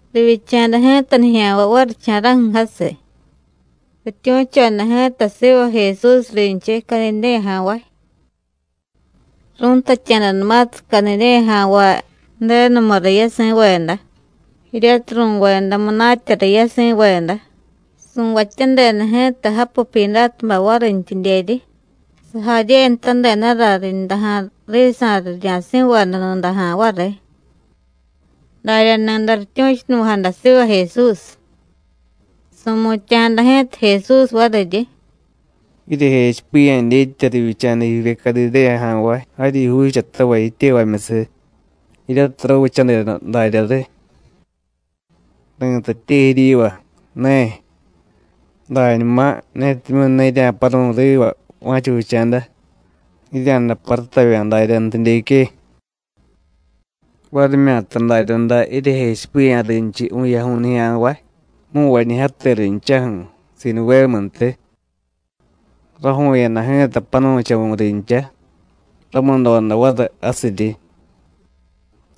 Rivyicha̱da ji̱ta nijya̱nvay varicha̱ra̱ju̱ jasiy, rityu̱choda ji̱ta siva Jesús rinchiy Cadidéyaja̱nvay. Ru̱ntatya̱danumatiy Cadidéyaja̱nvay Ju̱denumu riy yasi̱veda, jiryatiy ru̱veda munatya riy yasi̱veda, su̱vatyadeda ji̱ta japu Pyidátubay varintyidyeryi, sajaryenutadedara rindaja̱ risa̱ rirya̱si̱veda nudaja̱ variy. Darya ni̱day rityu̱chunuvi̱jada siva Jesús. Su̱mutya̱jada ji̱ta Jesús variryi: “Jiryejechipiya̱ dyetya rivyicha̱da jivye Cadidéyaja̱nvay jaryi juuchatavay jityevamyusiy, jiryatiy rávichadeda darya riy. Ri̱tatye jiryiva: Ne. Dañuma, netimyu̱ ne jirya̱paru̱y riva va̱cha vicha̱da, jirya̱day parutavya̱ daryantidyeque. Varimyata daryaday jiryejechipiya̱ rinchiy vu̱yaju̱y nijya̱nvay, mu̱nvañijyate rinchaju̱, Siduvémuntiy. Raju̱u̱yada ji̱ta panu̱chavu̱ rincha, ramudoda variy jasiryi.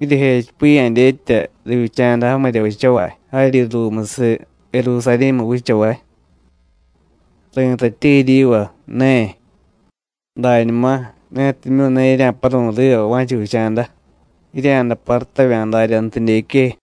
¿Jiryejechipiya̱ dyetya rivyicha̱da jamirya vichavay jaryi ruumusiy Jerusarí̱mu vichavay? Ri̱tatye jiryiva: Ne. Dañuma, netimyu̱ ne jirya̱paru̱y riva va̱cha vicha̱da, jirya̱day parutavya̱ daryantidyeque.”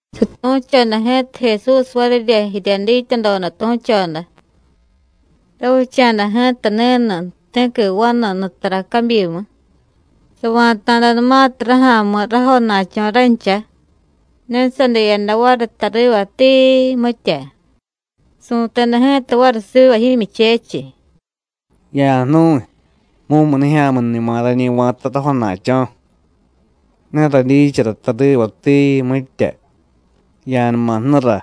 Satu̱choda ji̱ta Jesús varirya jirya dityadoda tu̱choda: “Ravicha̱da ji̱ta ni̱nu ti̱qui vanu nutara cabyimu. Sava̱ta̱danumatiy raja̱mi̱ rajona̱cho̱ rancha, ne sadiyada variy tariva tiii, mitya. Su̱teda ji̱ta variy siva jimyuchechiy: Ya̱jnu̱y, mumunijya̱miñuma rañi va̱ta rajona̱cho̱, ne radyichara tariva, tiii, mitya. Ya̱numa jnura;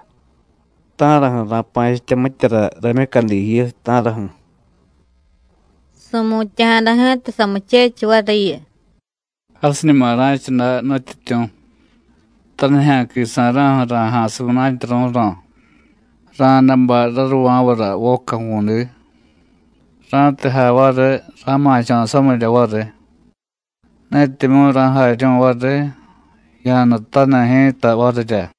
¿ta̱raju̱ ra̱pa̱chitya mityara ramyucadi jiyu, ta̱raju̱? Su̱mutya̱jada ji̱ta samuchechiy variyu: Jasiñuma ra̱cha day, Nutyityu̱. Tanijya̱quisa̱ra̱ju̱ ra̱ja̱siy munatya ru̱ro̱, ra̱day bay raruva̱vara voca ju̱vu̱di. Ra̱tiy jay variy, ra̱ma̱cho̱ samirya variy; netimyu̱ ra̱jaryu̱y variy, ya̱jnutaniy ji̱ta varirya.”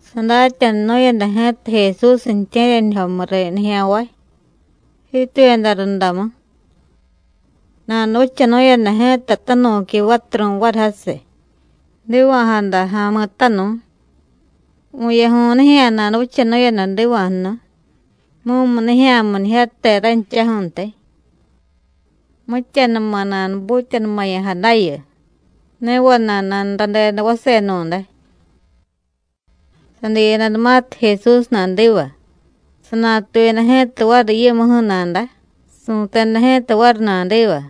Sadatyanunu̱yada ji̱ta Jesús ju̱tye̱ryanijyomu riy nijya̱nvay, jiituyada rundamu. Nanuvichanu̱yada ji̱ta tanu̱qui vaturu̱y variy jasiy, jdiva̱jada ja̱mi̱tanu̱y. Vu̱yaju̱y nijya̱ nanuvichanu̱yada jdiva̱jnu̱y, mumunijya̱miñijyate ranchaju̱ntiy. Mityanuma nanubutyanumaya̱jadayu, ne vana̱y nanuradeda vasenu̱day. Sadiyadanumatiy Jesús nadiva, sanatuyada ji̱ta variy yimuju̱ nada, su̱teda ji̱ta variy nadiva: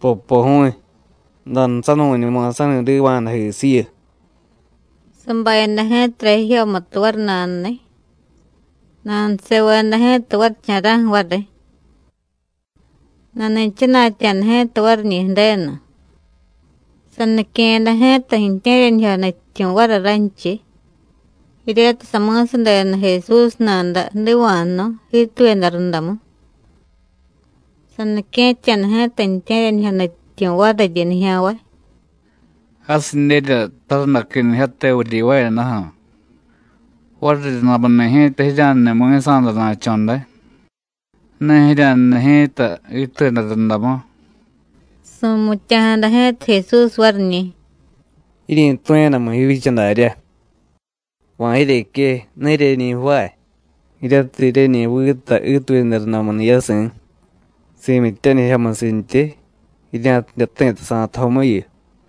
“Popoju̱y, jdanusanu̱ñuma sa̱ni̱diva̱jadajisiyu.” Sabayada ji̱tara jijyomutu variy nanuniy, nanuseveda ji̱ta varicha̱ra̱ju̱ variy. Nani̱chana̱tya̱da ji̱ta variñi̱ Ju̱denu. Sanique̱yada ji̱ta ju̱tye̱ryanijyo nutyityu̱ variy ranchiy, jiryatiy sami̱sadeda Jesús nada jdiva̱jnu̱y, jiituyada rundamu. Sanique̱tya̱da ji̱ta ju̱tye̱ryanijyo nutyityu̱ variryi nijya̱nvay: “Jasidyerya tarundaquinijyate vuryivaayadaju̱. Variryundamuni̱ ji̱ta jirya̱jniy mi̱sa̱dana̱cho̱ day; ne jirya̱jniy ji̱ta jiituyada rundamu.” Su̱mutya̱jada ji̱ta Jesús variñi̱: “Jiryi̱tu̱yadamu jivyicha darya. ¿Va̱ jiryeque, ne jiryeñi jvaay jiryatiy jiryeñi vita jiituyada rundamuni̱ yasi̱ si̱myityanijyomusintyi, jirya̱tidye jti̱ta sa̱tujomuyu?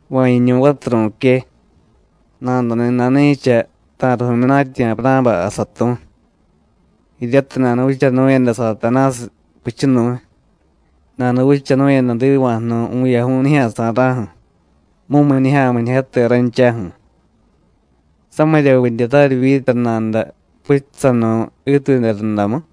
Va̱ jiñu̱y vaturu̱que, nadani̱ nani̱cha ta̱riy vu̱myunatyi̱ Avurá̱bay jasatu̱y. Jiryatiy nanuvichanu̱yada Satanásiy puchunu̱y, nanuvichanu̱yada jdiva̱jnu̱y vu̱yaju̱y nijya̱sa̱ra̱ju̱, mumunijya̱miñijyate ranchaju̱, ¿samiryavidye raryivyita nada puchusanu̱y jiituyada rundamu?”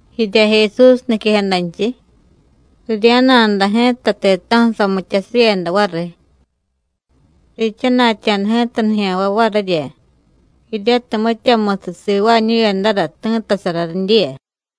Jirya Jesús niquejadanchiy, rirya̱na̱da ji̱ta ti̱ta̱ju̱ samityasivyeda variy. Riichana̱tya̱da ji̱ta nijya̱nvay varirya, jiryatiy mityamusiy sivaañu̱yadara ti̱ttasara ridyiya.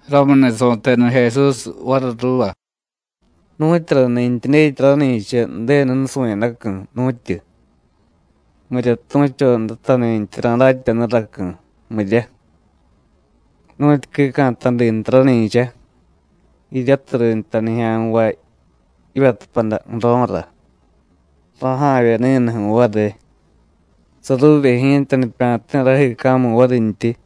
Ramuni̱ su̱teda Jesús variy ruuva: “¿Nu̱tyurani̱ntyi dyetya rani̱cha Ju̱denu nusu̱yadacu̱, nu̱tyu? ¿Mirya tu̱chodatani̱ntyi ra̱datyanuracu̱, mirya? Nu̱tyu quica̱tadi nta rani̱cha, jiryatiy rinta nijya̱nvay jivyatupada ju̱ro̱ra, raja̱vye ni̱nuju̱ variy, saruuvye ji̱ta nipya̱ti̱ rajiica̱mu varintyi.”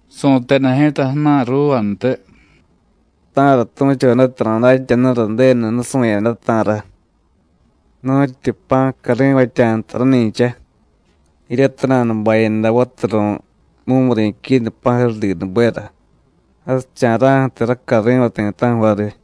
Su̱teda ji̱ta ju̱na̱y ruuvantiy: “¿Ta̱ra tu̱chodata ra̱datyanura Ju̱denu nusu̱yada, ta̱ra? Nu̱tyu pa̱ cari̱vatya̱ nta rani̱cha, jiryatiy nanubayada vaturu̱y mumuri̱ quinu pa̱jurudinubera, jasicha̱ra̱ju̱tiy racari̱vay ti̱ta̱ju̱ variy.”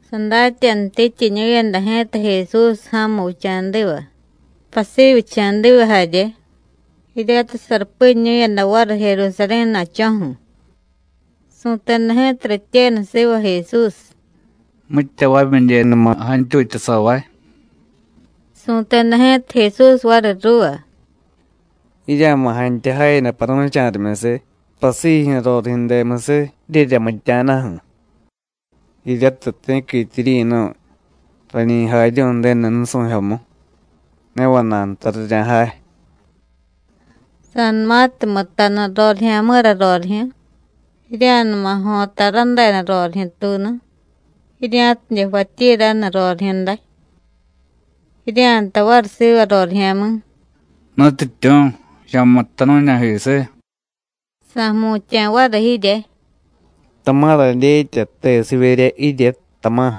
Sadatyanutityiñu̱yada ji̱ta Jesús ja̱mu vicha̱diva, pasivyicha̱diva jarye, jiryatiy sarupiñu̱yada variy Jerusarí̱ na̱cho̱ju̱. Su̱teda ji̱ta rityenu siva Jesús: “¿Mitya vamidyenuma jantyutyasavay?” Su̱teda ji̱ta Jesús variy ruuva: “Jirya̱ma̱ jantya jayada paru̱cha̱rimyusiy pasijyu̱ rorijyu̱demusiy jiryeryamitya̱daju̱, jiryatiy ti̱quitya jiryi̱nu̱y rañi jaryu̱y Ju̱denu nusu̱jyomu, ne vana̱y nta rirya̱jay. Sa̱numatiy mutanu rorijya̱mi̱ra rorijyu̱, jirya̱numa jo̱ta radeda rorijyu̱tuunu, jirya̱tidye jvatyi raniy rorijyu̱day. Jirya̱jtay variy siva rorijya̱mi̱: Nutyityu̱, ya̱mutta nu̱ña̱jisiy. Sa̱jmutya̱ variy jirye: Tama̱ radyetya tesivyerya jirye, tama̱.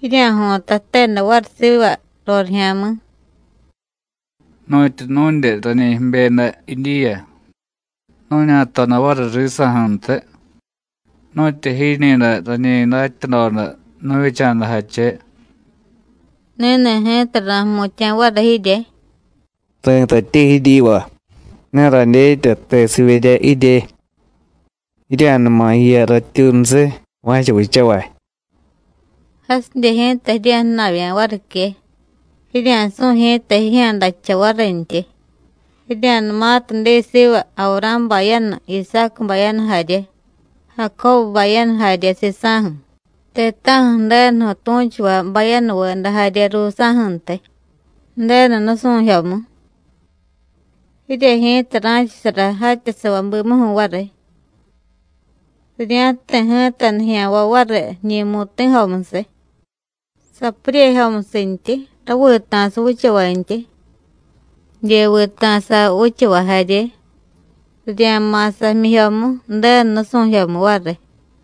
Jirya̱jo̱ta jteda variy siva rorijya̱mi̱: Nu̱tyu nu̱dye rañi jibyeda jidyiya, nu̱ña̱toda variy risa̱ju̱ntiy, nu̱tyu jiñi̱ day rañi datyadoda nu̱vyicha̱dajache. Ni̱ni̱ ji̱ta ra̱jmutya̱ variy jirye: Ri̱tatye jiryiva: Ne radyetya tesivyerya jirye; ¡Jirya̱numa jiya ratyuunusiy va̱cha vichavay! Jasidye ji̱ta jirya̱jna̱vya̱ varique, jirya̱su̱y ji̱ta jijya̱dajcha varintyi, jirya̱numatiy diy siva Avurá̱ bayanu, Isácu bayanu jarye, Jacóbu bayanu jarye sisa̱ju̱, ti̱ta̱ju̱ Ju̱denuju̱ tu̱chuvay bayanuveda jarye ruusa̱ju̱ntiy, Ju̱denu nusu̱jyomu. Jirye ji̱ta ra̱chasara jatyasavay bimuju̱ variy. Rirya̱jti̱ ji̱ta nijya̱nvay variy jiñi̱ mu̱ti̱jomusiy, sapuryejomusintyi, ravita̱sa vichavantyi, jidye vita̱sa vichavay jarye, rirya̱ma̱sa jmyijyomu Ju̱denu nusu̱jyomu variy.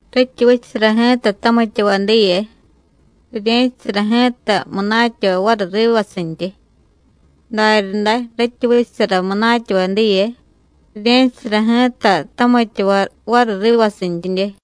Rityi vichasara ji̱ta tamityavay diye, rirye̱chasara ji̱ta munatyavay variy rivasintyi; daryaday rityi vichasara munatyavay diye, rirye̱chasara ji̱ta tamityavay variy rivasintyidye.”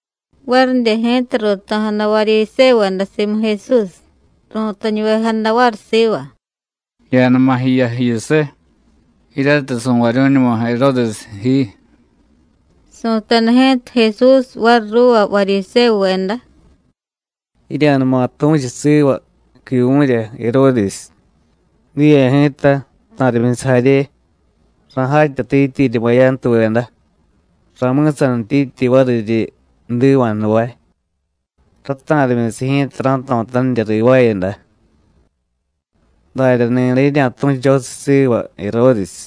Varidye ji̱ta ruuto̱jada Varyisévuveda simu Jesús, ru̱tañuvejada variy siva: “Ya̱numa jiya jiyusiy, jiryatiy su̱varyu̱ñuma Jeródes ji.” Su̱teda ji̱ta Jesús variy ruuva Varyisévuveda: “Jirya̱numa tu̱chu siva quivu̱rya Jeródes: Diye ji̱ta, ta̱rimyusiy jarye, ra̱jatyatityiryi bayantuveda, ra̱mi̱sanityityi variryi jdiva̱jnuvay; rata̱rimyusiy ji̱ta ra̱jto̱tanirya rivaayada. Darya ni̱day jirya̱tu̱chosiy siva Jeródes.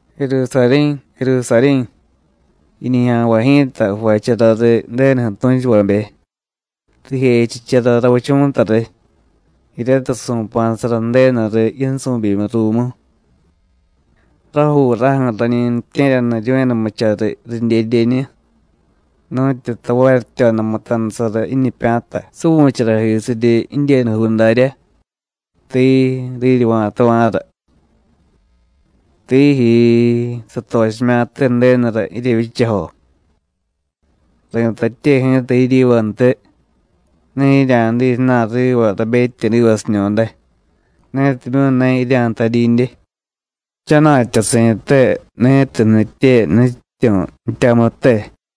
Jerusarí̱, Jerusarí̱, jiñijya̱nvay ji̱ta jvachara riy Ju̱denuju̱ tu̱chuvabe, rijechichara ravichu̱ta riy, jiryatiy su̱pa̱sara Ju̱denu riy yinsu̱byimiy ruumu. Rajuuraju̱ rañi ju̱tye̱ryaniryu̱yadanumucha riy ridyedyeñu, nu̱tyu tavaryityoda mutanusara jiñipya̱ta suvu̱charajisiryi jidyenujuu daryá; tiii, riryivya̱tava̱ra. ¡Tijyiii, satochimya̱ttye Ju̱denura jiryevyichajo! Ri̱tatye ji̱ta jiryivantiy: Ne jirya̱diy ju̱na̱y riva rabetyedivasiñu̱day, netimyu̱ ne jirya̱jtadyidye: ¡Jchana̱tyasi̱te ni̱tiy jnitye Nutyityu̱ jtyamute!”